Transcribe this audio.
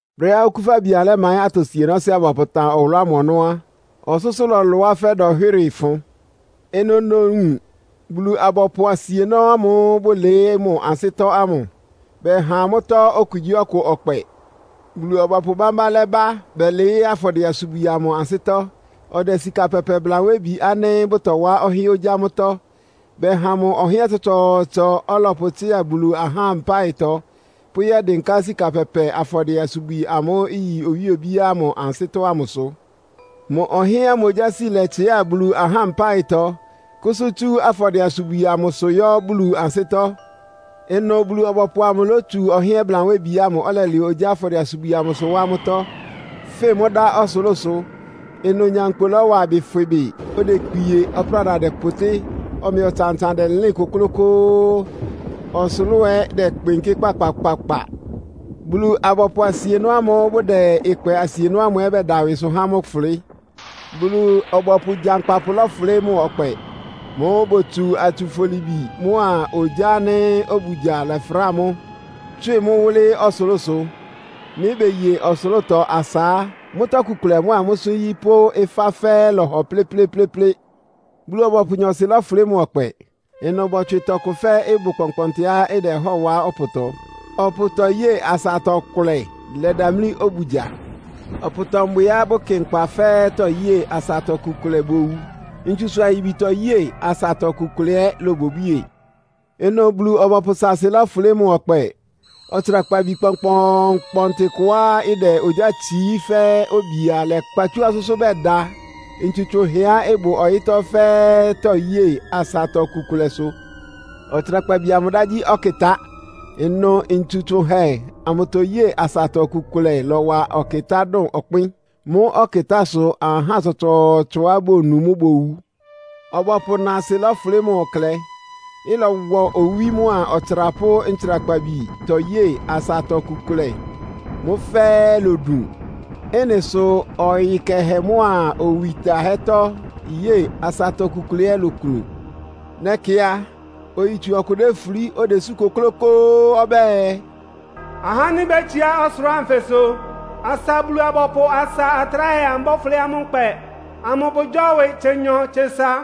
Brɛ́á Okúfabi amʋ lɛ́maɩ́n atɔ sienɔ́sɩ́á bɔpʋtan ɔwʋlʋ́ ámʋ ɔnɔ́ á, ɔsʋ́sʋ́ lɔlʋá fɛ́ dɔnhwɩ́rɩ-fʋn. Ɩnʋ nowun Bulu-abɔpʋ asienɔ́ ámʋ́ʋ́ bʋlɩɩ́ mʋ ansɩ́tɔ́ ámʋ. Bɛha amʋ́tɔ́ okugyíɔkʋ ɔkpɛ. Bulu-ɔbɔpʋ bámbá lɛ́bá bɛlɩɩ́ afɔdɩɛ-asubwi amʋ ansɩ́tɔ́. Ɔdɛ sika pɛpɛ blanwébi ánɩ́ bʋtɔwá ɔhɩ́ɛ́n ogyá mʋ́tɔ́. Bɛha mʋ ɔhɩ́ɛ́n tsɔtsɔɔtsɔ, ɔlɔpʋtsɩ́a Bulu ahá mpáɩtɔ, pʋ́yɛ́dɩnká sika pɛpɛ afɔdɩɛ-asubwi amʋ́ʋ́ iyi owíe obíá ámʋ ansɩ́tɔ́ ámʋsʋ. Mʋ ɔhɩ́ɛ́n ámʋ ogyási lɛtsɩ́a Bulu ahá ámʋ mpáɩtɔ, kʋ́sʋ́ tsú afɔdɩɛ-asubwi ámʋsʋ yɔ́ Bulu ansɩ́tɔ́. Ɩnʋ Bulu-ɔbɔpʋ amʋ lótsu ɔhɩ́ɛ́n blanwébi ámʋ, ɔlɛlɛ ogyá afɔdɩɛ-asubwi ámʋsʋ wá mʋ́tɔ́, fɩn mʋ́ dá ɔsʋlʋ́sʋ. Ɩnʋ nyankpʋ lɔ́wa ɩbɩ fwɩ bɩ. Odekpie, ɔpráda dɛpʋtɩ́, ɔmɛ ɔtsan-ɔtsan dɛlɩ́ɩn kʋ́klʋ́kʋ́ʋ́, ɔsʋlʋ́ʋ ɛ́ dɛkpɩnkɩ́ kpakpakpakpa. Bulu-abɔpʋ asienɔ́ ámʋ́ʋ́ bʋdɛ ɩkpɛ asienɔ́ ámʋ ɛ́ bɛda ɩwɩsʋ há mʋ́ fʋlɩ́. Bulu-ɔbɔpʋ gyankpapʋ lɔ́fʋlɩ́ mʋ ɔkpɛ. Mʋ́ʋ́ botsu atsufolibi mʋ́a ogyá ánɩ́ obugya lɛfráa mʋ́, tswɩ mʋ́ wʋ́lɩ́ ɔsʋlʋ́sʋ. Nɩ́ beye ɔsʋlʋ́tɔ asa á, mʋ́tɔ́ iku kʋlɛ mʋ́a mʋ́sʋ́ nyí pʋ́ mʋ́sʋ́ ɩfá fɛ́ɛ́ lɔhɔ plɩ́plɩ́plɩ́plɩ́. Bulu-ɔbɔpʋ nyɔɔsɩ lɔ́fʋlɩ́ mʋ ɔkpɛ. Ɩnʋ bɔtswɩ tɔkʋ fɛ́ ɩbʋ kpɔnkpɔntɩá ɩdɛhɔ́ɔ wá ɔpʋtɔ, ɔpʋtɔ yée asatɔ ɩkʋlɛ lɛdamlí obugya. Ɔpʋtɔ mbwɩá bʋkɩ nkpa fɛ́ɛ́tɔ́ yée asatɔ iku kʋlɛ bowu, ntsusʋ ayibitɔ yée asatɔ iku kʋlɛ ɛ́ lobwiebwíe. Ɩnʋ Bulu-ɔbɔpʋ sáásɩ́ lɔ́fʋlɩ́ mʋ ɔkpɛ. Ɔtsrakpabi kpɔnkpɔɔnkpɔntɩ kʋá ɩdɛ ogyá tsií fɛ́ obia lɛ́kpa tsú ɔsʋ́sʋ́ bɛda ntsu tsʋnhɛá ɩbʋ ɔyɩ́tɔ́ fɛ́ɛ́tɔ́ye asatɔ iku kʋlɛsʋ. Ɔtsrakpabi amʋ dá gyí “Ɔkɩtá.” Ɩnʋ ntsu tsʋnhɛ amʋtɔyée asatɔ iku kʋlɛ lɔ́wa ɔkɩtá dʋn ɔkpɩ́n. Mʋ́ ɔkɩtá sʋ ahá tsɔtsɔɔtsɔá bonu mʋ́ bowu. Ɔbɔpʋ náásɩ́ lɔ́fʋlɩ́ mʋ klɛ. Ɩlɔwɔ owí mʋ́a ɔtsra pʋ́ ntsrakpabitɔ yée asatɔ iku kʋlɛ. Mʋ́ fɛ́ɛ́ lodun. Ɩ́nɩ sʋ ɔyɩ kɛhɛ mʋ́a owi tahɛ́tɔ́ yée asatɔ iku kʋlɛ ɛ́ loklun. Nɛkɩ a, oyitsu ɔkʋ défulí, odesú kʋklʋ́kʋ́ʋ́ ɔbɛ́ɛ, “Ahá ánɩ́ bétsiá ɔsʋlʋ́ʋ anfɩsʋ asa Bulu-abɔpʋ asa atráhɛ amʋ bɔ́fʋlɩ́ amʋ́ nkpɛ amʋ bʋgyɔ́wɩ tsenyɔ-tsesa!”